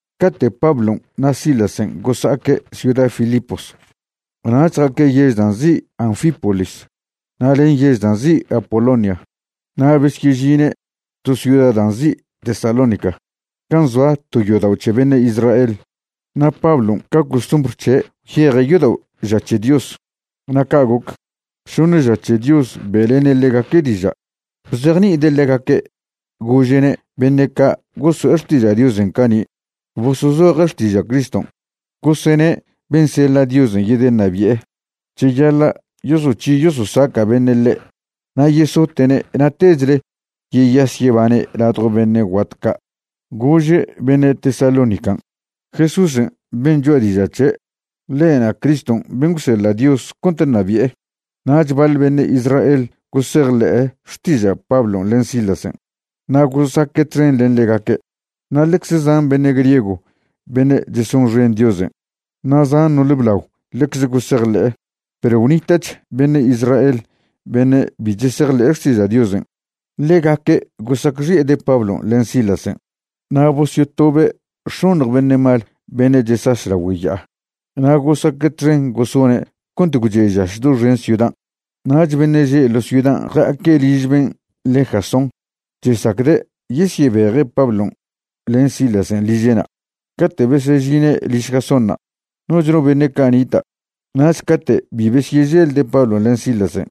Cate' Pablon' na' Silasen' gosa'aque' ciuda Filipos nach ja'aque' yež da' nzi' Anfípolis na' len yež da' nzi' Apolonia na' besyežine' to ciuda da' nzi' Tesalónica gan' zoa to yodao' c̱he beṉe' Israel. Na' Pablon' ca costumbr c̱he' gwyeje' yodao' ža c̱he Dios. Na' ca' goc, šoṉe ža c̱he Dios be'lene' ḻegaque' diža'. Bzejni'ide' ḻegaque' gože'ne' beṉe' ca' goso'e xtiža' Diosen' cani' bosozoje' xtiža' Criston'. Gosene' ben' seḻa' Dios yedeṉabi'e, cheyaḻa' yosoc̱hi yososaca' beṉe' ḻe' na' yesote'ne' na' techle yeyas yebane' ladjo beṉe' guat ca'. Gože' beṉe' Tesalónican': ―Jesúsen' ben' choa' diža' c̱he', ḻe'na' Criston' ben' gwseḻa' Dios cont ṉabi'e. Nach baḻ beṉe' Israel gosejḻe'e xtiža' Pablon' len Silasen' na' gosaque' txen len ḻegaque', na' ḻecze zan beṉe' griego beṉe' chesonxen Diosen' na' zan no'ole blao ḻecze gosejḻe'e. Perw gwnita'ch beṉe' Israel beṉe' bi chesejḻe'e xtiža' Diosen'. Ḻegaque' gosacxi'ede' Pablon' len Silasen' na' bosyotobe' x̱oṉj beṉe' mal beṉe' chesaš lagüe ya'a na' gosaque' txen gosone' cont gwche' žaš doxen ciudan'. Nach beṉe' že' ḻo ciudan' ja'aque' liž ben' le' Jasón chesacde' yesyebeje' Pablon' len Silasen' liže'na'. Cate' besežine' liž Jasónṉa', noch no beṉe' ca' nita'. Nach cate' bi besyeželde' Pablon' len Silasen',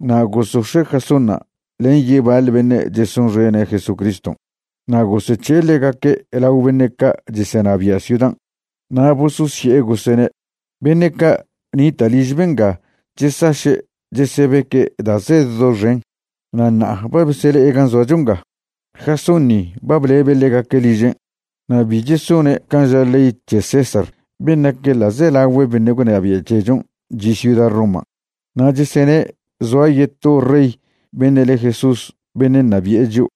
na' gosox̱e' Jasónṉa' len yebaḻ beṉe' chesonxene' Jesuscriston' na' gosec̱he'e ḻegaque' lao beṉe' ca' chesenabia' ciudan', na' bososye'e gosene': ―Beṉe' ca' nita' liž benga chesaše' chesebeque' da' zed doxen, na' ṉa'a ba besele'e gan' zoacho nga. Jasón ni ba blebe' ḻegaque' ližen', na' bi chesone' can' ža ley c̱he César ben' nac ḻa'zelagüe beṉe' gwnabia' c̱hechon' chi' ciuda Roman', na' chesene' zoa yeto rey beṉe' le Jesús beṉe' ṉabi'e chio'.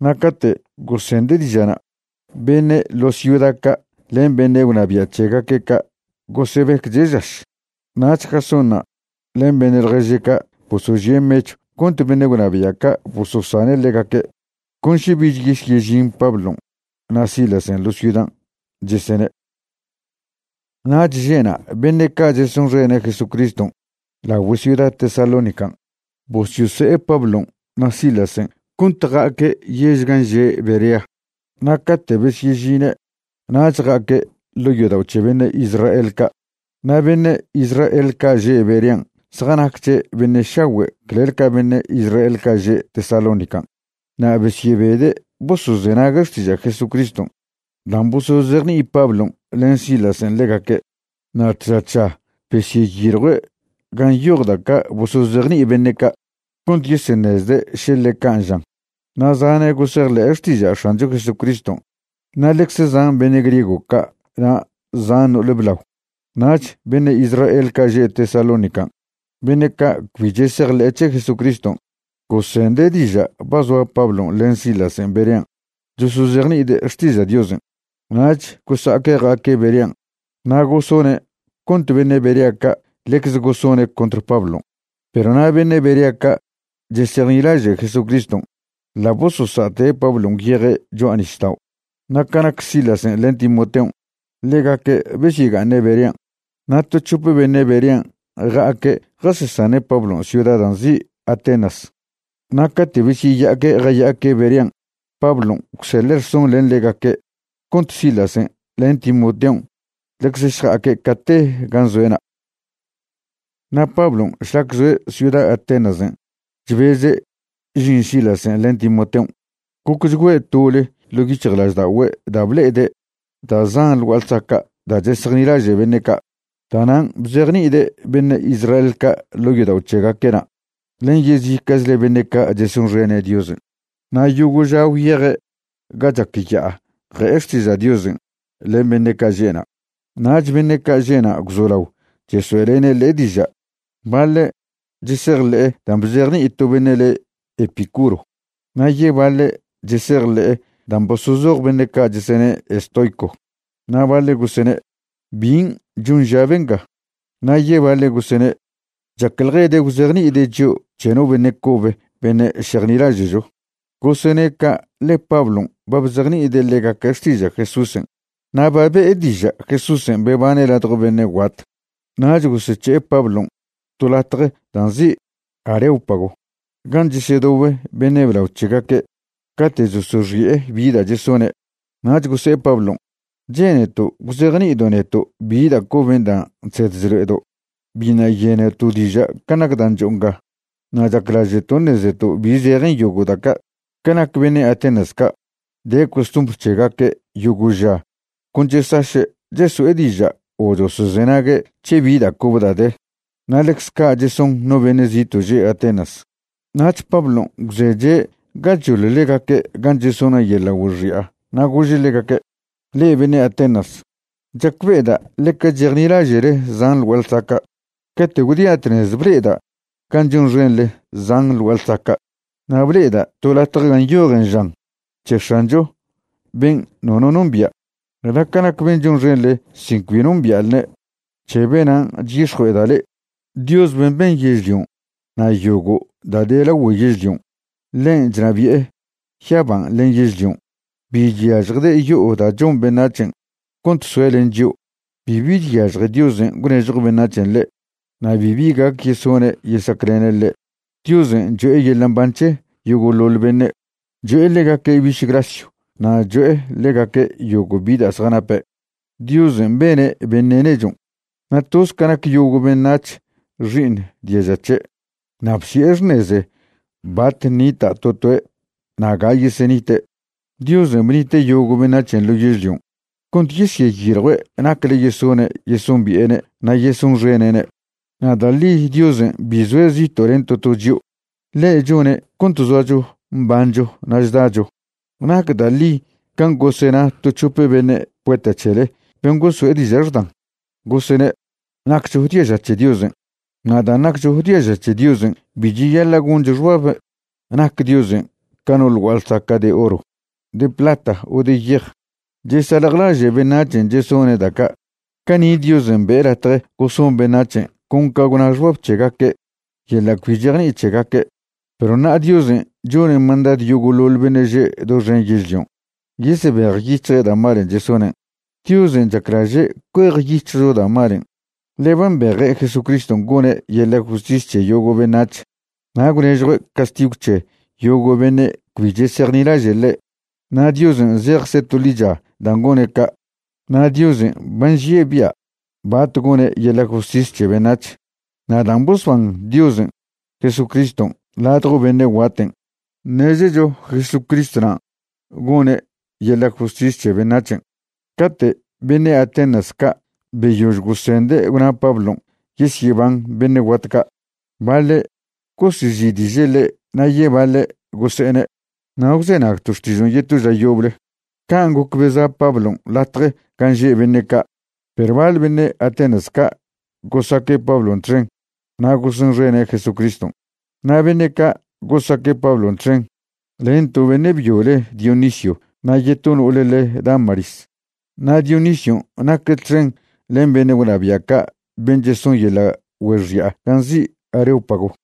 Na' cate' gosende' diža'na', beṉe' ḻo ciuda ca' len beṉe' gwnabia' c̱hegaque' ca' gosebecche' žaš. Nach Jasónṉa' len beṉe' ḻježe' ca' bosožie' mechw cont beṉe' gwnabia' ca' bososane' ḻegaque', con še bich yesyežin Pablon' na' Silasen' ḻo ciudan', chesene'. Nach že'na' beṉe' ca' chesonxene' Jesucriston' lagüe ciuda Tesalónican' bosyose'e Pablon' na' Silasen' cont ja'aque' yež gan' že' Berea. Na' cate' besyežine' nach ja'aque' ḻo' yodao' c̱he beṉe' Israel ca'. Na' beṉe' Israel ca' že' Berean' zjanacche' beṉe' šagüe' clel ca beṉe' Israel ca' že' Tesalónican' na' besyebede' bosozenague' xtiža' Jesucriston' dan' bosozejni'i Pablon' len Silasen' ḻegaque'. Na' tža tža besyeyiljue' gan' nyoj da' ca' bosozejni'i beṉe' ca', cont yeseṉezde' še ḻe can' žan. Na' zane' gosejḻe'e xtiža' X̱ancho Jesucriston' na' ḻecze zan beṉe' griego ca' na' zan no'ole blao. Nach beṉe' Israel ca' že' Tesalónican' beṉe' ca' cbi chesejḻe' c̱he Jesucriston', gosende' diža' ba zoa Pablon' len Silasen' Berean' chosozejni'ide' xtiža' Diosen'. Nach gosa'aque' ja'aque' Berean' na' gosone' cont beṉe' Berea ca' ḻecz gosone' contr Pablon'. Perw na' beṉe' Berea ca' chesejnilaže' Jesucriston' ḻa' bososa'te' Pablon' gwyeje' cho'a nisdao'. Na' ca nac Silasen' len Timoteon', ḻegaque' besyega'aṉe' Berean'. Na' to c̱hop beṉe' Berean' ja'aque' jasesane' Pablon' ciuda dan' nzi' Atenas. Na' cate' besyeya'aque' jaya'aque' Berean' Pablon' gwseḻe' rson len ḻegaque' cont Silasen' len Timoteon' ḻecz šja'aque' cate gan' zoe'na'. Na' Pablon' šlac zoe' ciuda Atenasen' chbeze' žin Silasen' len Timoteon', gocchgüe' tole ḻo' yic̱hjlažda'ogüe' da' ble'ede' da' zan ḻ gua'a ḻsaca' da' chesejnilaže' beṉe' ca'. Da'nan' bzejni'ide' beṉe' Israel ca' ḻo' yodao' c̱hegaque'na' len yezica'chle beṉe' ca' chesonxene' Diosen'. Na' yogo' ža gwyeje' ga chac ya'a je'e xtiža' Diosen' len beṉe' ca' že'na'. Nach beṉe' ca' že'na' gwzolao chesoe'lene' ḻe' diža'. Baḻe' chesejḻe'e dan' bzejni'i to beṉe' le' Epicuro, na' yebaḻe' chesejḻe'e dan' bosozoj beṉe' ca' chesene' estoico. Na' baḻe' gosene': ―¿Bin' chon ža benga? Na' yebaḻe' gosene': ―Chacḻjede' gwzejni'ide' chio' c̱he no beṉe' cobe beṉe' šejnilaže'cho. Gosene' ca' ḻe Pablon' ba bzejni'ide' ḻegaque' xtiža' Jesúsen' na' ba be'e diža' Jesúsen' bebane' ladjo beṉe' guat. Nach gosec̱he'e Pablon' to latje dan' nzi' Areópago gan' chesedobe beṉe' blao c̱hegaque' cate' chosoxi'e bi da' chesone'. Nach gose'e Pablon': ―Che'neto' gwzejni'ido' neto' bi da' coben' dan' chsed chlo'edo'. Biṉa' yeneto' diža' can' nac dan' cho'o nga na' chaclaže'to' ṉezeto' bi zejen yogo' da' ca'. Ca nac beṉe' Atenas ca', de costumbr c̱hegaque' yogo' ža con chesaše' cheso'e diža' o chosozenague' c̱he bi da' cobe da' de, na' ḻecz ca' cheson no beṉe' zito' že' Atenas. Nach Pablon' gwzeche' gachoḻ ḻegaque' gan' chesone' yeḻa' güexi'a na' gože' ḻegaque': ―Le'e beṉe' Atenas, chacbe'eda' ḻeca chejnilaže'le zan ḻ gua'a ḻsaca'. Cate' gwdia' tnez ble'eda' gan' chonxenḻe zan ḻ gua'a ḻsaca', na' ble'eda' to latje gan' nyojen žan: “C̱he X̱ancho ben' nono nombia'.” Na' ca nac ben' chonxenḻe sin cbi nombia'lne', c̱he benan' chyix̱jue'eda' le'e. ’Dios ben' ben yežlion' na' yogo' da' de lagüe yežlion', ḻen' chnabi'e yaban' len yežlion'. Bi chyažjde' yo'o da' chon beṉac̱hen' cont soe' len chio'. Bibi chyažje Diosen' gwnežjo beṉac̱hen' ḻe', na' bibi gac yesone' yesaclene' ḻe'. Diosen' cho'e yeḻa' mban c̱he yogo'ḻoḻ beṉe', cho'e ḻegaque' biš grasyw na' cho'e ḻegaque' yogo' bi da' zjanape'. ’Diosen' bene' beṉe' nechon', na' toz ca nac yogo' beṉac̱h xi'iṉ diaža c̱he'. Na' bsi'e xṉeze bat ṉita' to toe' na' ga yesenite'. Diosen' bnite' yogo' beṉac̱hen' ḻo yežlion' cont yeseyiljue' nacle yesone' yesombi'ene' na' yesonxene'ne'. Na' da' ḻi Diosen' bi zoe' zito' len to to chio'. Ḻe' chone' cont zoacho mbancho na' chdacho. Nac da' ḻi can' gosena to c̱hope beṉe' poeta c̱hele ben' goso'e diža' xdan, gosene': “Naccho diaža c̱he Diosen'.” Na' dan' naccho diaža c̱he Diosen' bi cheyaḻa' goncho xbab nac Diosen' ca no ḻ gua'a ḻsaca' de oro, de plata o de yej. Chesaḻjlaže' beṉac̱hen' chesone' da' ca'. Cani' Diosen' be'e latje goson beṉac̱hen' con ca gwna xbab c̱hegaque' yeḻa' cbi chejni'i c̱hegaque', perw ṉa'a Diosen' chone' mandadw yogo'ḻoḻ beṉe' že' doxen yežlion' yesebejyic̱hje' da' malen' chesonen'. Diosen' chaclaže' cuejyic̱hjcho da' malen', ḻe ba mbeje' Jesucriston' gone' yeḻa' justis c̱he yogo' beṉac̱h na' gwnežjue' castigw c̱he yogo' beṉe' cbi chesejnilaže' ḻe', na' Diosen' zejcze' to ḻicha dan' gone' ca'. Na' Diosen' ba nžie' bia' bat gone' yeḻa' justis c̱he beṉac̱h. Na' dan' bosban Diosen' Jesucriston' ladjo beṉe' guaten', ṉezecho Jesucristwnan' gone' yeḻa' justis c̱he beṉac̱hen'. Cate' beṉe' Atenas ca' beyož gosende' gwna Pablon' yesyeban beṉe' guat ca', baḻe' gosezi'diže' ḻe' na' yebaḻe' gose'ene': ―Na' gwzenagto' xtižon' yeto ža yoble. Can' goc beza' Pablon' latje gan' že' beṉe' ca'. Perw baḻ beṉe' Atenas ca' gosaque' Pablon' txen na' gosonxene' Jesucriston'. Na' beṉe' ca' gosaque' Pablon' txen len to beṉe' byo le Dionisio na' yeto no'ole le Dámaris. Na' Dionision' naque' txen len beṉe' gwnabia' ca' ben' cheson yeḻa' güexi'a gan' nzi' Areópago.